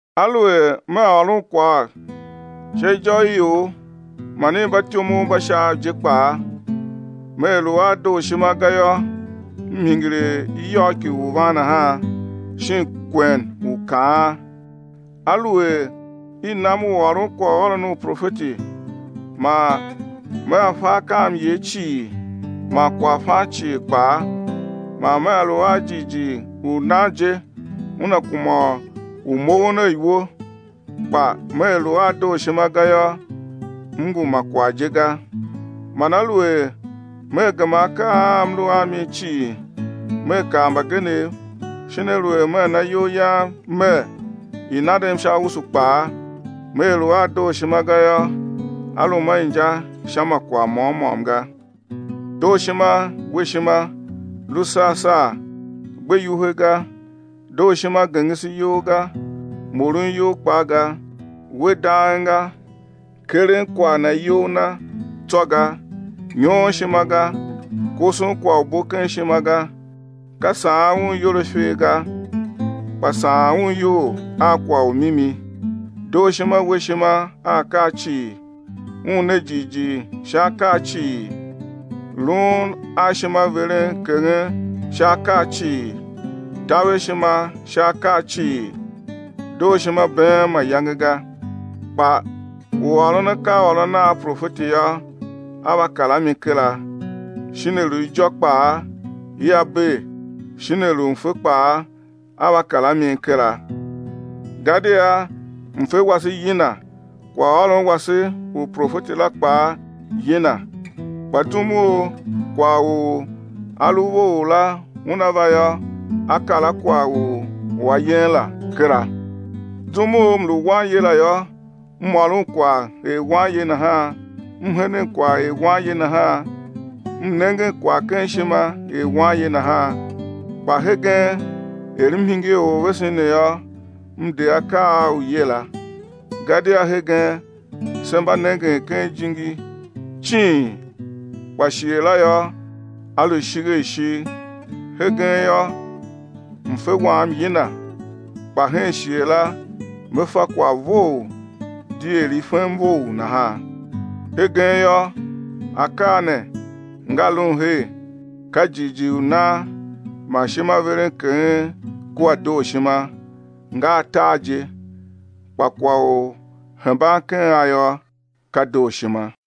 Aluer mea ôron kwagh sha ijô i ior man i mbatyomov mba Shaav je kpaa, mea lu a dooshima ga yô, m hingir er iyôgh ki uvan nahan, shin kwen u kaan. Aluer i nam u ôron kwaghôron u profeti man mea fa akaamyer cii man kwaghfan cii kpaa, man mea lu a jighjigh u nan je una kuma u moughon a iwo, kpa mea lu a dooshima ga yô, m ngu ma kwagh je ga. Man aluer mea gema akaa a m lu a mi cii, mea kar mbagenev shin aluer mea na iyol yam mer, i̱ nandem sha usu kpaa, mea lu a dooshima ga yô, á lum a inja sha ma kwagh môm môm ga. Dooshima we ishima, lu sar sar gbe iwuhe ga; dooshima gengese iyol ga, moron iyol kpaa ga, we dang ga, keren kwagh na iyol na tsô ga, nyoon ishima ga, koson kwagh u bo ken ishima ga. Ka saan un iyol a ifer ga, kpa saan un iyol a kwagh u mimi. Dooshima we ishima a akaa cii; un ne jighjigh sha akaa cii, luun a ishimaverenkeghen sha akaa cii, taver ishima sha akaa cii. Dooshima been mayange ga, kpa u ôron akaaôron a profeti yô, á va kar a mi kera, shin a lu ijô kpaa, ia bee, shin a lu mfe kpaa, á va kar a mi kera. Gadia mfe wase yina, kwaghôron wase u profeti la kpaa yina. Kpa zum u kwagh u a lu vough la una va yô, á kar a kwagh u a yen la kera. Zum u m lu wanye la yô, m ôron kwagh er wanye nahan, m henen kwagh er wanye nahan, m nengen kwagh ken ishima er wanye nahan. Kpa hegen er m hingir orvesen ne yô, m de akaa a uye la. Gadia hegen se mba nengen ken ijingi cing kpa shighe la yô, á lu ishigh a ishigh. Hegen yô, mfe wam yina kpa hen shighe la me fa kwagh vough di er i fem vough nahan. Hegen yô, akaa ne nga lun her, ka jighjigh u nan man ishimaverenkeghen kua dooshima, nga atar je; kpa kwagh u hemban ken a yô, ka dooshima.